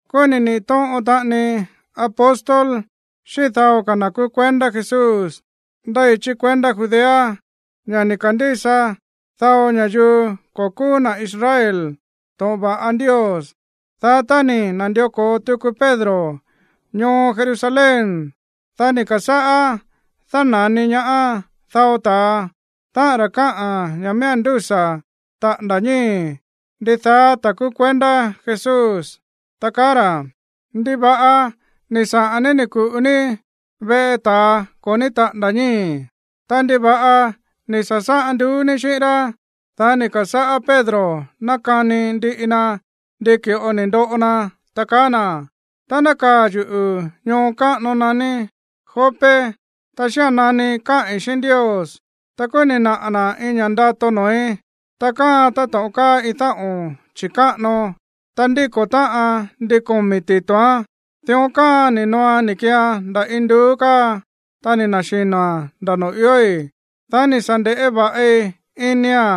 Kúú ni̱ niꞌi̱ tóꞌon taꞌani apóstol xíꞌín dao ka̱ na̱ kúú kuendá Jesús ndéi chí kuendá Judea ña̱ ni̱ ka̱ndísa dao ña̱yuu ko̱ kúú na̱ Israel to̱ꞌon va̱ꞌa Ndios. Dá tá ni̱ na̱ndió ko̱o tuku Pedro ñoo Jerusalén, dá ni̱ ka̱sáꞌá dána̱ni ñaá dao ta̱a, táꞌa̱n ra̱ kaá ña̱ miía̱n ndúsa̱ taꞌa̱nda̱ ñíi̱ ndidaá ta̱a kúú kuendá Jesús, ta kaá ra̱: ―¿Ndiva̱ꞌa ni̱ saꞌa̱n ní ni̱ ku̱ꞌu ní veꞌe ta̱a ko̱ ní táꞌa̱nda̱ ñii̱? Ta, ¿ndiva̱ꞌa ni̱ sa̱sáꞌan nduú ní xíꞌín rá? Dá ni̱ ka̱sáꞌá Pedro nákani ndiꞌi na ndi ki̱ꞌo ni̱ ndoꞌo na, ta kaá na̱: ―Tá nákaa̱ yuꞌu̱ ñoo káꞌano naní Jope, ta xía̱n nani káꞌi̱n xíꞌín Ndios, ta kúú ni̱ naꞌa̱ na̱ iin ña̱ꞌa ndato noo̱í. Ta káaan táto̱ꞌon káa iin dáꞌo̱n chi̱káꞌano. Ta ndíko̱ táꞌan ndin komi̱ tito̱án. Dión káaan ni̱ nooan ni̱ kiian nda̱ induú káa. Ta ni̱ na̱xino̱a̱n nda̱ noo̱ iói̱. Dá ni̱ sa̱ nde̱ꞌé va̱ꞌi inia̱n,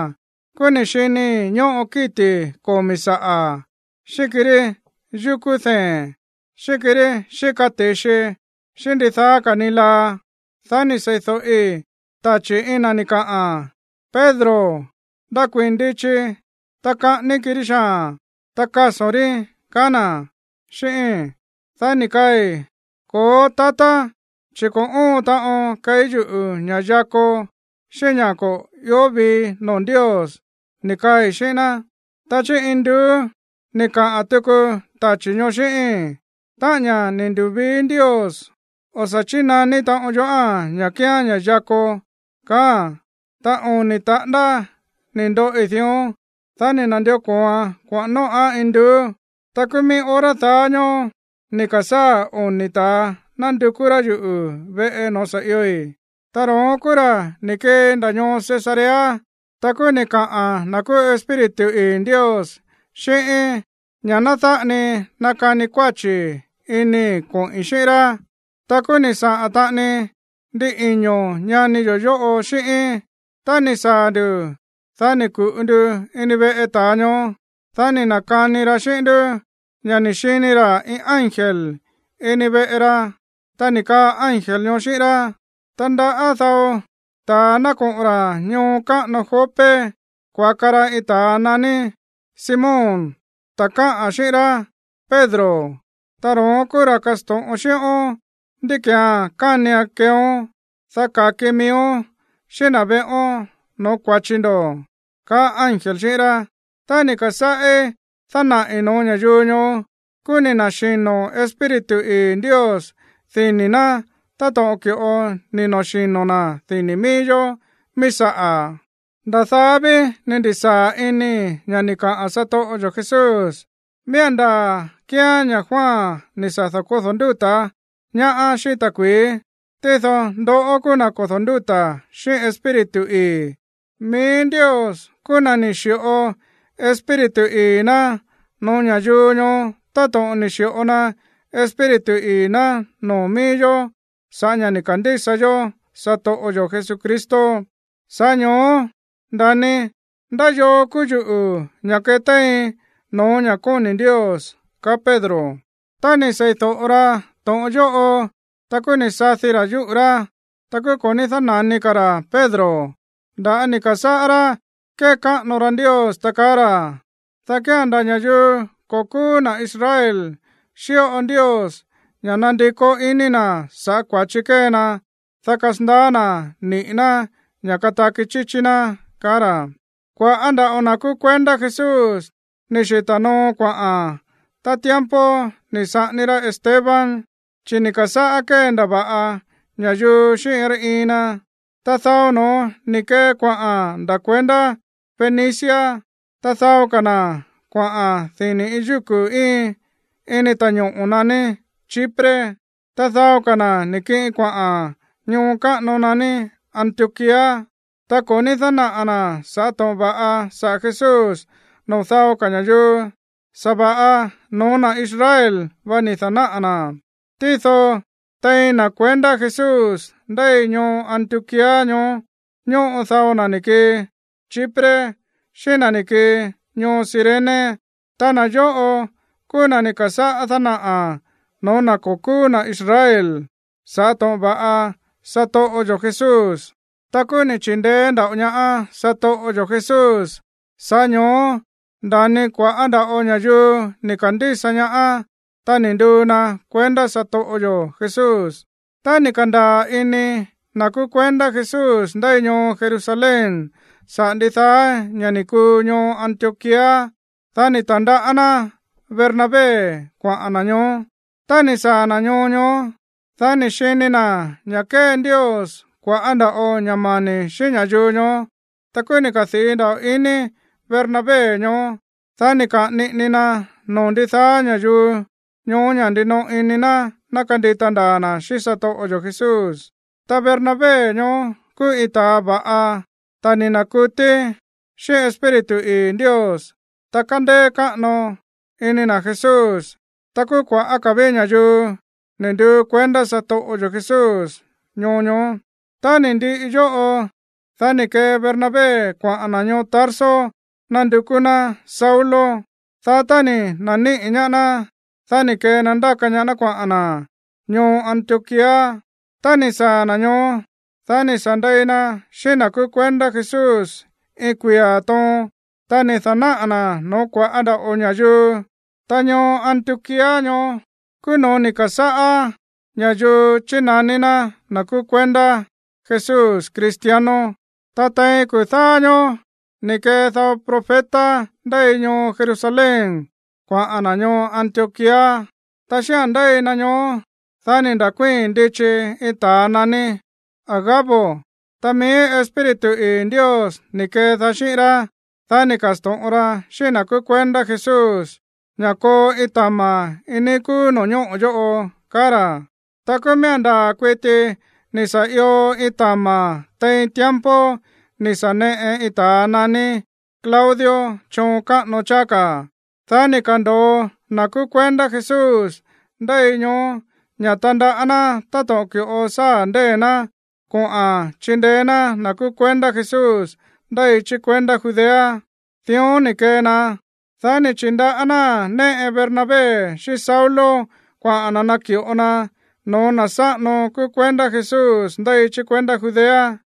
kúú ni̱ xinii̱ ñóꞌo kíti̱ komi̱ saꞌa̱, xíꞌín kirí yukú dee̱n, xíꞌín kirí xíka ti̱xi, xíꞌín ndidaá ka̱ ni laa. Dá ni̱ sei̱do̱ꞌi tachi̱ iin na̱ ni̱ kaꞌa̱n: “Pedro, ndakuii̱n ndichi. Ta kaꞌání kirí xaa̱n, ta kaso̱n rí”, kaá na̱ xíꞌíi̱n. Dá ni̱ kaai̱: “Ko̱ó, tatá, chi̱ ko̱ óon taꞌon keí yuꞌu̱ ña̱ꞌa yako xíꞌín ña̱ ko̱ ió vii noo̱ Ndios”, ni̱ kaai̱ xíꞌín ná. Ta chí induú ni̱ kaꞌa̱n tuku tachi̱ ñoó xíꞌíi̱n: “Táꞌa̱n ña̱ ni̱ ndu̱vii Ndios, o̱ sa̱ chínaní taꞌon yoꞌáa̱n ña̱ kía̱n ña̱ yako”, kaáa̱n. Ta oni̱ taꞌándá ni̱ ndoꞌi dión. Dá ni̱ na̱ndió ko̱oan kuaꞌa̱n nóꞌa̱n induú. ’Ta kúú mií hora daá ñóó ni̱ ka̱sáa̱ oni̱ ta̱a nándukú rá yuꞌu̱ veꞌe noo̱ sa̱ ioi̱. Ta ro̱ón kúú ra̱ ni̱ kii nda̱ ñoo Cesarea. Ta kúú ni̱ kaꞌa̱n na̱ kúú Espíritu ii̱ Ndios xíꞌíín ña̱ ná dáꞌa ni nakani kuáchi̱ inii̱ koꞌi̱n xíꞌín rá. Ta kúú ni̱ saꞌa̱n taꞌani ndin iño̱ ñani yo̱ yóꞌo xíꞌíín. Tá ni̱ saa̱ nduꞌu̱, dá ni̱ ku̱ꞌu ndu ini veꞌe ta̱a ñoó. Dá ni̱ na̱kani ra xíꞌín ndú ña̱ ni̱ xini ra̱ iin ángel ini veꞌe ra, ta ni̱ kaa ángel ñoó xíꞌín rá: “Tandaꞌá dao ta̱a ná koꞌo̱n ra̱ ñoo káꞌano Jope kuaka ra iin ta̱a naní Simón, ta̱ káꞌa̱n xíꞌín rá Pedro. Ta ro̱ón kúú ra̱ kasto̱ꞌon xíꞌón ndí ki̱án kánian keeón, dá ka̱ki miíón xíꞌín na̱ veꞌón no̱ó kua̱chi ndo̱”, kaá ángel xíꞌín rá. Tá ni̱ ka̱sáꞌí dánaꞌi̱ no̱ó ña̱yuu ñoó, kúú ni̱ na̱xino̱ Espíritu ii̱ Ndios dini̱ ná táto̱ꞌon ki̱ꞌo ni̱ na̱xino̱ na̱ dini̱ mií yó mií saꞌa̱. Nda̱ daá ví ni̱ ndi̱sáa̱ inii̱ ña̱ ni̱ kaꞌa̱n satoꞌo yo̱ Jesús: “Miía̱n ndaa̱ kíán ña̱ Juan ni̱ sa̱ da̱kódo̱ ndúta̱ ñaá xíꞌín ta̱kui̱í, tído ndoꞌó kúú na̱ kodo̱ ndúta̱ xíꞌín Espíritu ii̱.” Mií Ndios kúú na̱ ni̱ xi̱ꞌo Espíritu ii̱ ná no̱ó ña̱yuu ñoó táto̱ꞌon ni̱ xi̱ꞌo na Espíritu ii̱ ná noo̱ mií yó sa̱ꞌá ña̱ ni̱ ka̱ndísa yó satoꞌo yo̱ Jesucristo. Sa̱ꞌá ño̱ó nda̱ni, ¿ndá yoo kúú yuꞌu̱ ña̱ ketéiin no̱ó ña̱ kóni̱ Ndios? ―kaá Pedro. Tá ni̱ sei̱do̱ꞌo ra to̱ꞌon yóꞌo, ta kúú ni̱ sadi ra̱ yúꞌu̱ rá, ta kúú ko̱ ní dána̱ni ka̱ ra̱ Pedro. Nda̱á ni̱ ka̱sáꞌá rá kékáꞌano ra Ndios, ta kaá ra̱: ―Dá kía̱n nda̱ ña̱yuu ko̱ kúú na̱ Israel xíꞌo Ndios ña̱ nandikó iní na̱ sa̱ꞌá kua̱chi kée na, dá kasandaá na̱ niꞌi̱ ná ña̱ kataki chíchí ná ―kaá ra̱. Kua̱ꞌá nda̱ꞌo na̱ kúú kuendá Jesús ni̱ xita̱ noo kuaꞌa̱n tá tiempo ni̱ saꞌání rá Esteban, chi̱ ni̱ ka̱sáꞌá kéndava̱ꞌa ña̱yuu xíꞌín iin rá iin na. Ta dao no̱ón ni̱ kee kuaꞌa̱n nda̱ kuendá Fenicia. Ta dao ka̱ na̱ kuaꞌa̱n iin yúku̱ íin ini ta̱ñoꞌo̱ naní Chipre. Ta dao ka̱ na̱ ni̱ kiꞌin kuaꞌa̱n ñoo káꞌano naní Antioquía. Ta ko̱ ní dánaꞌa̱ na̱ sa̱ꞌá to̱ꞌon va̱ꞌa saꞌa̱ Jesús noo̱ dao ka̱ ña̱yuu, sa̱va̱ꞌa no̱ó na̱ Israel vá ni̱ da̱náꞌa̱ na̱án. Tído tein na̱ kuendá Jesús ndéi ñoo Antioquía ñoó ñóꞌo dao na̱ ni̱ kii Chipre xíꞌín na̱ ni̱ kii ñoo Cirene. Ta na̱ yóꞌo kúú na̱ ni̱ ka̱sáꞌá dánaꞌa̱ no̱ó na̱ ko̱ kúú na̱ Israel sa̱ꞌá to̱ꞌon va̱ꞌa satoꞌo yo̱ Jesús. Ta kúú ni̱ chi̱ndeé nda̱ꞌo ñaá satoꞌo yo̱ Jesús. Sa̱ꞌá ño̱ó nda̱ni kua̱ꞌá nda̱ꞌo ña̱yuu ni̱ ka̱ndísa ñaá, ta ni̱ nduu na kuendá satoꞌo yo̱ Jesús. Tá ni̱ ka̱ndaa̱ ini na̱ kúú kuendá Jesús ndéi ñoo Jerusalén saꞌa̱ ndidaá ña̱ ni̱ kuu ñoo Antioquía, dá ni̱ ta̱ndaꞌá ná Bernabé kuaꞌa̱n na̱ ñoó. Tá ni̱ saa̱ na̱ ñoo ñoó, dá ni̱ xini na̱ ña̱ kée Ndios kua̱ꞌá nda̱ꞌo ña̱ mani̱ xíꞌín ña̱yuu ñoó. Ta kúú ni̱ kadii̱ nda̱ꞌo ini Bernabé ñoó. Dá ni̱ kaꞌa̱n niꞌini na noo̱ ndidaá ña̱yuu ñoó ña̱ ndinoꞌo ini na̱ ná kandita ndaa̱ na̱ xíꞌín satoꞌo yo̱ Jesús. Ta Bernabé ñoó kúú iin ta̱a va̱ꞌa, ta̱ ni̱ na̱kutí xíꞌín Espíritu ii̱ Ndios, ta kándéé káꞌano ini na̱ Jesús. Ta kúú kua̱ꞌá ka̱ ví ña̱yuu ni̱ nduu kuendá satoꞌo yo̱ Jesús ñoo ñoó. Tá ni̱ ndiꞌi yóꞌo, dá ni̱ kee Bernabé kuaꞌa̱n na̱ ñoo Tarso nándukú ná Saulo. Dá tá ni̱ na̱níꞌi̱ ñaá ná, dá ni̱ kee na ndáka ñaá ná kuaꞌa̱n na̱ ñoo Antioquía. Tá ni̱ saa̱ na̱ ñoó, dá ni̱ sa̱ ndei na xíꞌín na̱ kúú kuendá Jesús iin kuia̱ toon. Ta ni̱ da̱náꞌa̱ na̱ no̱ó kua̱ꞌá nda̱ꞌo ña̱yuu. Ta ñoo Antioquía ñoó kúú noo̱ ni̱ ka̱sáꞌá ña̱yuu chínaní ná na̱ kúú kuendá Jesús, cristianos. Ta tein kuu̱ dáá ñóó ni̱ kee dao profeta ndéi ñoo Jerusalén kuaꞌa̱n na̱ ñoo Antioquía. Ta xía̱n ndéi na ñoó, dá ni̱ nda̱kuíi̱n ndichi iin ta̱a naní Agabo. Ta mií Espíritu ii̱ Ndios ni̱ kedaá xíꞌín rá, dá ni̱ ka̱sto̱ꞌon ra xíꞌín na̱ kúú kuendá Jesús ña̱ koo iin tama̱ iin níí kúú no̱ñóꞌo̱ yóꞌo, kaá ra̱. Ta kúú miía̱n ndaa̱ kuiti ni̱ sa̱ io iin tama̱ tein tiempo ni̱ sa̱ neꞌe iin ta̱a naní Claudio choon káꞌano cháá ka̱. Dá ni̱ ka̱ndo̱o na̱ kúú kuendá Jesús ndéi ñoó ña̱ tandaꞌá ná táto̱ꞌon ki̱ꞌo sáa̱ ndée̱ ná koꞌa̱n chindeé ná na̱ kúú kuendá Jesús ndéi chí kuendá Judea. Dión ni̱ kee na, dá ni̱ chi̱ndaꞌá náa̱n néꞌe Bernabé xíꞌín Saulo kuaꞌa̱n na̱ naki̱ꞌo naa̱n no̱ó na̱ sáꞌano kúú kuendá Jesús ndéi chí kuendá Judea.